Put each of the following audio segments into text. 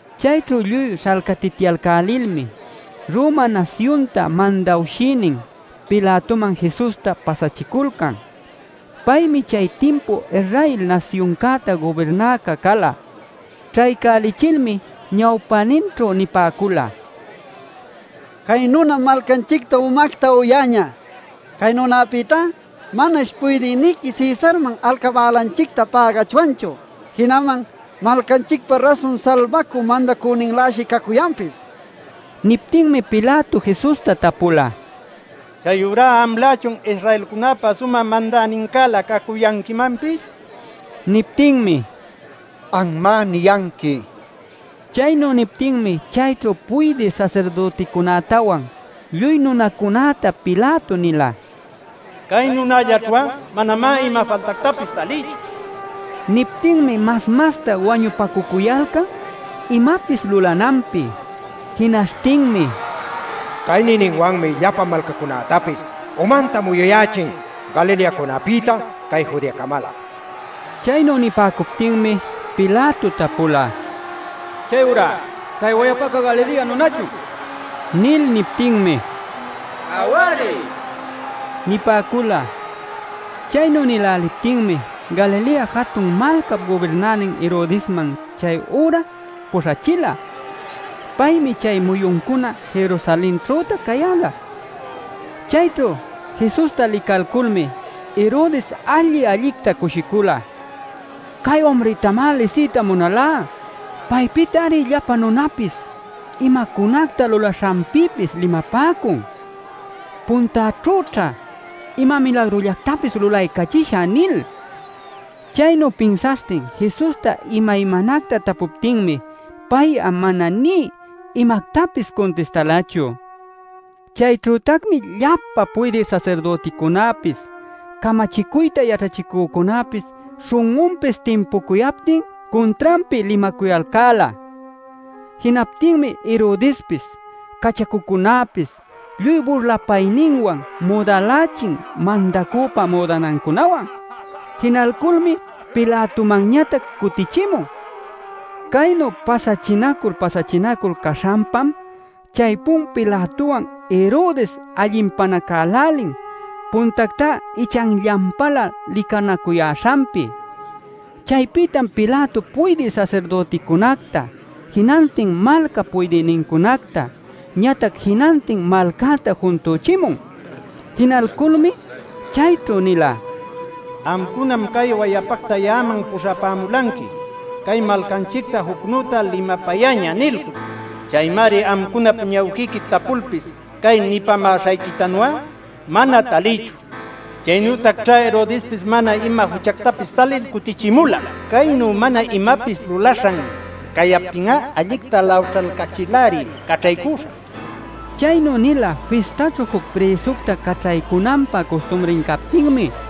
Chayćhu lluy śhalcatityalcälilmi Roma nasyunta mandawshïnin Pilatoman Jesusta pasachiculcan. Paymi chay timpu Israel nasyuncäta gubirnäca cala. Ćhaycälichilmi ñawpäninćhu nipäcula: “Cay nunam malcanchicta umacta uyäñä. Cay nunapïtá manash Puydïniqui Cesarman alcabälanchicta pägachwanchu. Jinaman malcanchicpa rasun Salbacü Mandacünincäläshi cacuyanpis” nil. Niptinmi Pilato Jesusta tapula: “¿Chayurá amlächun Israelcunäpa sumä mandänincälä cacuyanquimanpis?” nil. Niptinmi: “Anmá niyanqui” nin. Chaynu niptinmi chayćhu puydï sasirdüticunätawan lluy nunacunäta Pilato nila: “Cay nunällaćhu'a manamá ima faltactapis talïchu” nil. Niptinmi mas-masta wañupacucuyalcan imapis lulananpi. Jinaśhtinmi: “Cay niyninwanmi llapa malcacunätapis umanta muyuyächin Galileacunapïta cay Judeacamalä” nicuyalcan. Chaynu nipäcuptinmi Pilato tapula: “¿Chayurá cay wayapaca Galilea nunachun?” nil. Niptinmi: “Aw-ari” nipäcula. Chaynu nïläliptinmi Galilea jatun malcap gubirnänin Herodesman chay üra puśhachila. Paymi chay muyuncuna Jerusalenćhütac cayäla. Chayćhu Jesusta licalculmi Herodes alli-allicta cushicula: “Cay umrïtamá lisiyta munalá. Paypïtari llapa nunapis imacunacta lulaśhanpïpis limapäcun. Puntäćhüćha ima milagrullactapis lulaycachishä” nil. Chaynu pinsaśhtin Jesusta imaymanacta tapuptinmi pay'a mana nï imactapis cuntistalachu. Chayćhütacmi llapa puydï sasirdüticunäpis, camachicuyta yaćhachicücunäpis śhun'unpis timpucuyaptin cuntranpi limacuyalcäla. Jinaptinmi Herodespis cachacucunäpis lluy burlapayninwan müdälächin mandacüpa müdanancunawan. Jinalculmi Pilatomanñatac cutïchimun. Caynu pasachinacul pasachinacul caśhanpam chaypun Pilatowan Herodes allinpanacälälin puntactá ichanllanpalä licanacuyäśhanpi. Chaypïtam Pilato puydï sasirdüticunacta, jinantin malcap puydïnincunacta, ñatac jinantin malcäta juntüchimun. Jinalculmi chayćhu nila: “Amcunam cay wayapacta ya'aman puśhapämulanqui ‘Cay malcanchictam jucnüta limapayäñä’ nilcul. Chaymari amcunap ñawquiqui tapulpis cay nipämäśhayquitanu'a mana talïchu. Chaynütacćhá Herodespis mana ima juchactapis talil cutichimula. Caynu mana imapis lulaśhan cayaptin'a allicta lawćhalcachil-ari caćhaycüśhä” nin. ˻ Chaynu nila fistaćhu juc prïsucta caćhaycunanpä custumri captinmi.˼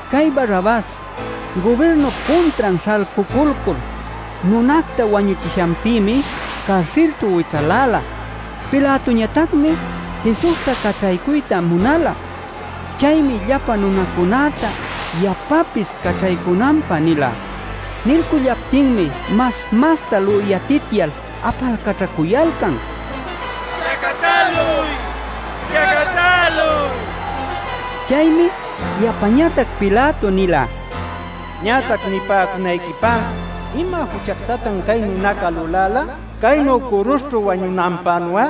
Cay Barrabas gubirnup cuntran śhalcuculcul nunacta wañuchishanpïmi carsilćhu wićhaläla.) Pilatoñatacmi Jesusta caćhaycuyta munala. Chaymi llapa nunacunäta yapapis caćhaycunanpä nila. Nilcullaptinmi mas-masta lüyatityal apalcaćhacuyalcan: “¡Chacatäluy! ¡Chacatäluy!” nil. Chaymi yapañatac Pilato nila: “Ñatac nipäcunayquipá ¿ima juchactatan cay nunaca luläla? Caynu curuśhćhu wañunanpänu'a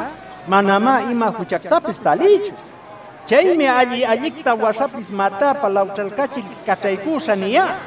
manamá ima juchantapis talïchu. Chaymi ‘Alli-allicta waśhapis matäpä lawćhalcachil caćhaycuśhä’ niyá” nin.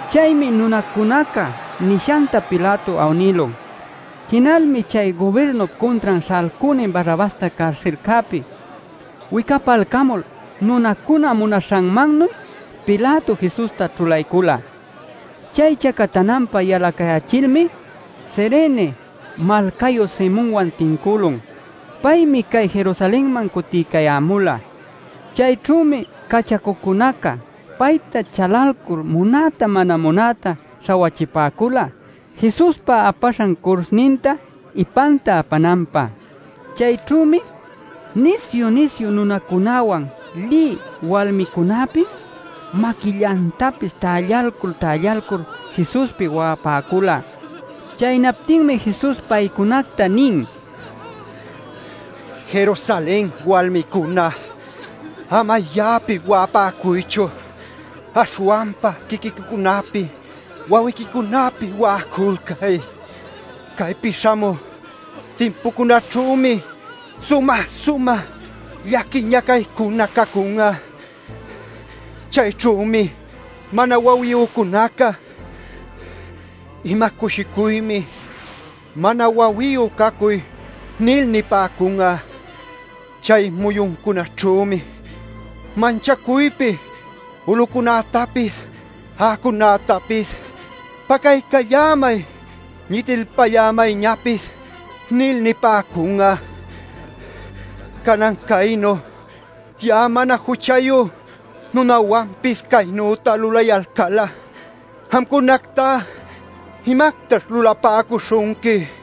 Chaymi nunacunaca nishanta Pilato awnïlun. Jinalmi chay gubirnup cuntran śhalcünin Barrabasta carsilcäpi wicapalcamul nunacuna munaśhanmannuy Pilato Jesusta ćhulaycula. Chay chacatananpä yalacayächilmi Cirene malcayu Simonwan tincülun. Paymi cay Jerusalenman cutiycayämula. Chayćhümi cachacucunaca payta chalalcul munäta mana munäta śhawachipäcula Jesuspa apaśhan curuśhninta ipanta apananpä. Chayćhümi nisyu-nisyu nunacunäwan lï walmicunäpis maquillantapis tällalcul-tällalcul Jesuspi wa'apäcula. Chaynaptinmi Jesus paycunacta nin: “Jerusalen walmicuna, ama ya'api wa'apäcuychu; aśhwanpa quiquiquicunapi wawiquicunapi wa'aculcay. Caypi śhamü timpucunaćhümi sumä-sumä llaqui ñacaycuna cacun'a. Chayćhümi mana wawiyücunaca ‘ima cushicuymi mana wawiyu cacuy’ nil nipäcun'a. Chay muyuncunaćhümi manchacuypi ulucunätapis a'acunätapis ‘¡Pacaycallämay! ¡Ñitilpallämayñapis!’ nil nipäcun'a. Canan caynu ya'a mana juchayu nunawanpis caynüta lulayalcal'a, amcunactá ¿imactaćh lulapäcuśhunqui?” nil.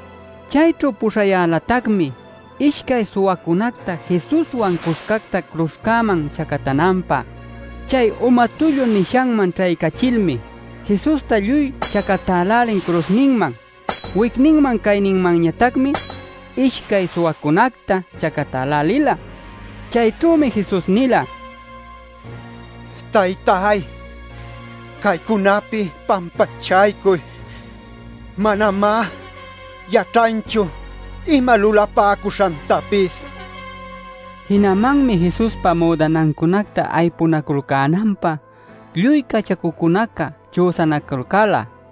Chayćhu puśhayälatacmi ishcay suwacunacta Jesuswan cuscacta curuśhman chacatananpä. Chay “Uma Tullu” nishanman ćhaycachilmi Jesusta lluy chacatälälin curuśhninman. Wicninman cayninmanñatacmi ishcay suwacunacta chacatälälila. Chayćhümi Jesus nila: “Taytay, caycunapi pampachaycuy. Manamá yaćhanchu ima lulapäcuśhantapis” nil. Jinamanmi Jesuspa müdanancunacta aypunaculcänanpä lluy cachacucunaca chüsanaculcäla.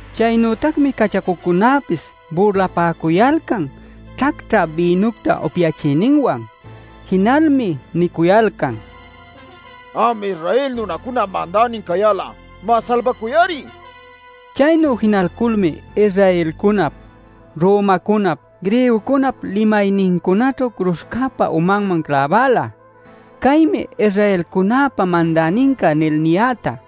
Chaynütacmi cachacucunäpis burlapäcuyalcan ćhacćhä bïnucta upyachiyninwan. Jinalmi nicuyalcan: “Am Israel nunacunap mandänin cayal'a, má, salbacuy-ari” nil. Chaynu jinalculmi Israelcunap, Romacunap, Griegocunap limaynincunaćhu curuśhcäpa umanman cläbala “Caymi Israelcunäpa Mandäninca” nil niyäta.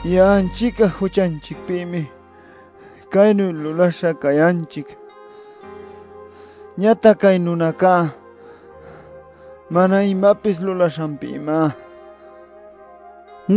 Ya'anchic'a juchanchicpïmi caynu lulaśha cayanchic. Ñatac cay nunacá mana imapis lulaśhanpïmá” nil.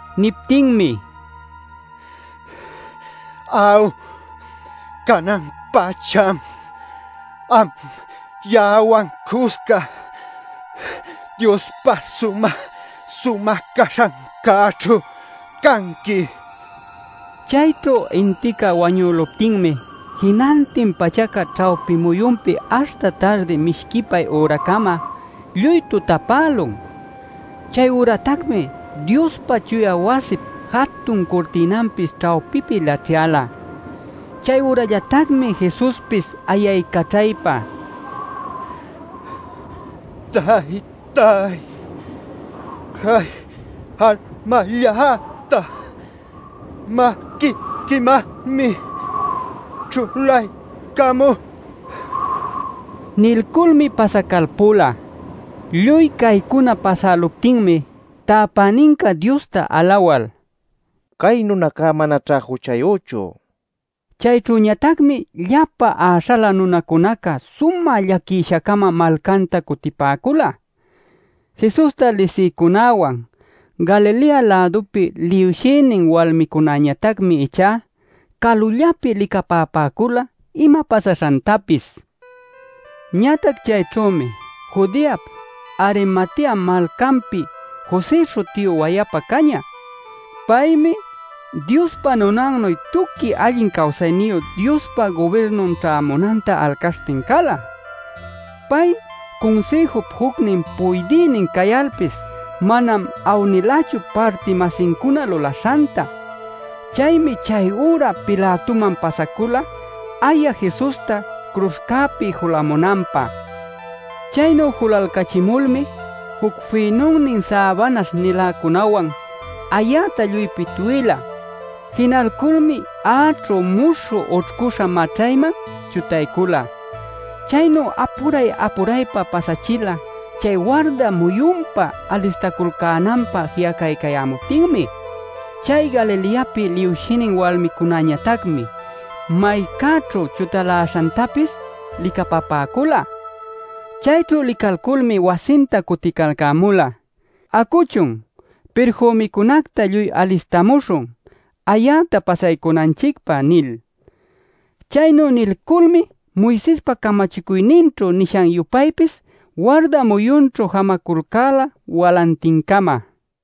Niptinmi: “Aw, canan-pacham am ya'awan cusca Diospa sumä-sumä caśhancäćhu canqui” nila. Chayćhu intica wañüluptinmi jinantin pachaca ćhawpi muyunpi aśhta tardi mishquipay üracama lluy tutapälun. Chayüratacmi Diospa chuya wasip jatun curtïnanpis ćhawpipi laćhyäla. Chayürallatacmi Jesuspis ayaycaćhaypa: “Taytay, cay almalläta maquiquimanmi ćhulaycamú” nila. Nilculmi pasacalpula. Lluy caycuna pasäluptinmi täpäninca Diosta alawal: “Cay nunaca manaćhá juchayüchu” nila. Chayćhüñatacmi llapa äśhalä nunacunaca sumä llaquisha-cama malcanta cutipäcula. Jesusta lisïcunawan Galilea-lädupi liwshïnin walmicunäñatacmi ichá calullapi licapapäcula ima pasaśhantapis. Ñatac chayćhümi Judeap Arimatea malcanpi José śhutiyu wayapa cañä. Paymi Diospa nunannuy tuqui allin cawsayniyu Diospa gubirnun ćhämunanta alcaśhtin cala. Pay Cunsïjup jucnin puydïnin cayalpis manam awnilachu parti-masincuna lulaśhanta. Chaymi chayüra Pilatoman pasacula aya Jesusta curuśhcäpi julamunanpä. Chaynu julalcachimulmi juc fïnunnin säbanaśh-niläcunawan ayäta lluy pitwïla. Jinalculmi a'aćhu muśhü ućhcüśha maćhayman chutaycula. Caynu apura-apuraypa pasachila chay warda muyunpä alistaculcänanpä ji'acaycayämuptinmi. Chay Galileapi liwshïnin walmicunañatacmi maycäćhu chutaläśhantapis licapapäcula. Chayćhu licalcamulmi wasinta cuticalcämula: “Acuchun, pirfümicunacta lluy alistamuśhun ayäta pasaycunanchicpä” nil. Chaynu nilculmi Moisespa camachicuyninćhu nishan-yupaypis warda muyunćhu jamaculcäla walantincama.